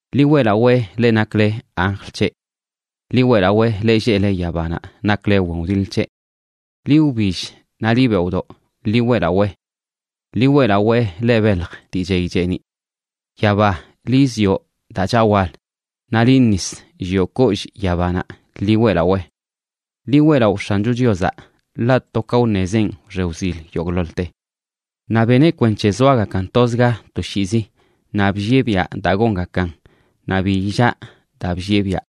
Ḻi weꞌlawee leꞌ nakle anjl c̱heꞌ. Ḻi weꞌlawee leꞌ lleꞌle yabanaꞌ nakle wen wdiḻ c̱heꞌ. Liꞌ wbill naꞌ liꞌ beoꞌdoꞌ, ḻi weꞌlawee. Ḻi weꞌlawee, leꞌ belj dii chey cheeniꞌ. Yaba, liꞌ zioꞌ daa chaꞌ wal, naꞌ liꞌ nis, llioꞌ kollꞌ yabanaꞌ, ḻi weꞌlawee. Ḻi weꞌlaꞌo X̱ancho Chiozaꞌ, ḻaꞌ to ka wṉezenꞌ wxe wzil yogꞌḻoḻte. Naꞌ beneꞌ kwenc̱he zoagakan tozga toshiizi, naꞌ bllieꞌ biaꞌ daa gongakan naꞌ bi illaa daa bllieꞌ biaꞌ.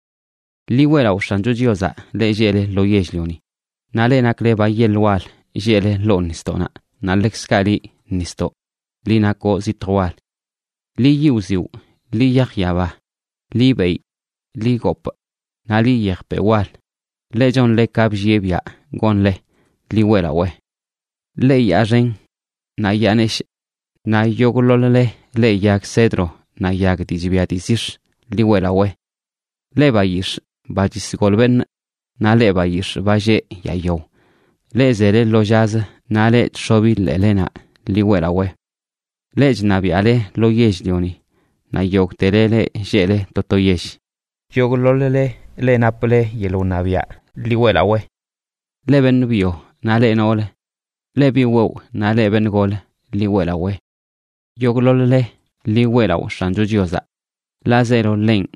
Ḻi weꞌlaꞌo X̱ancho Chiozaꞌ leꞌ lleꞌle lo yell-lioni, naꞌ leꞌ nakle ba yeḻə wal lleꞌle ḻoo nisdoꞌnaꞌ, naꞌ ḻekzkaꞌ liꞌ nisdoꞌ, liꞌ nakoꞌ zitj wal. Liꞌ yiꞌ wziwꞌ, liꞌ yaj yaba, liꞌ beyꞌ, liꞌ gopꞌ, naꞌ liꞌ yejpeꞌ wal, leꞌ chonle ka bllieꞌ biaꞌ gonle, ḻi weꞌlawee. Leꞌ yaa xen naꞌ yaa neshꞌ, naꞌ yogꞌḻoḻ-le leꞌ yag cedro naꞌ yag dii chbia dii zix̱, ḻi weꞌlawee. Leꞌ bayix̱ꞌ ba chisgol beṉꞌ, naꞌ leꞌ bayix̱ꞌ ba lleꞌ yaa yao, leꞌ zele lo llazə naꞌ leꞌ chx̱obi ḻeelenaꞌ, ḻi weꞌlawee. Leꞌ chṉabiaꞌle lo yell-lioni, naꞌ yogꞌtele leꞌ lleꞌle to to yell, yogꞌḻoḻ-le leꞌ naple yeḻꞌ wṉabiaꞌ, ḻi weꞌlawee. Leꞌ beṉꞌ byo naꞌ leꞌ noolə, leꞌ bi wewꞌ naꞌ leꞌ beṉꞌ gol, ḻi weꞌlawee. Yogꞌḻoḻ-le, ḻi weꞌlaꞌo X̱ancho Chiozaꞌ, ḻaꞌ zeelo ḻenꞌ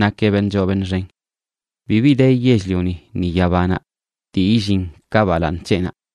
nakeꞌ beṉꞌ choo beṉꞌ xen. Bibi de yell-lioni ni yabanaꞌ dii illin ka balaaṉ c̱heꞌnaꞌ.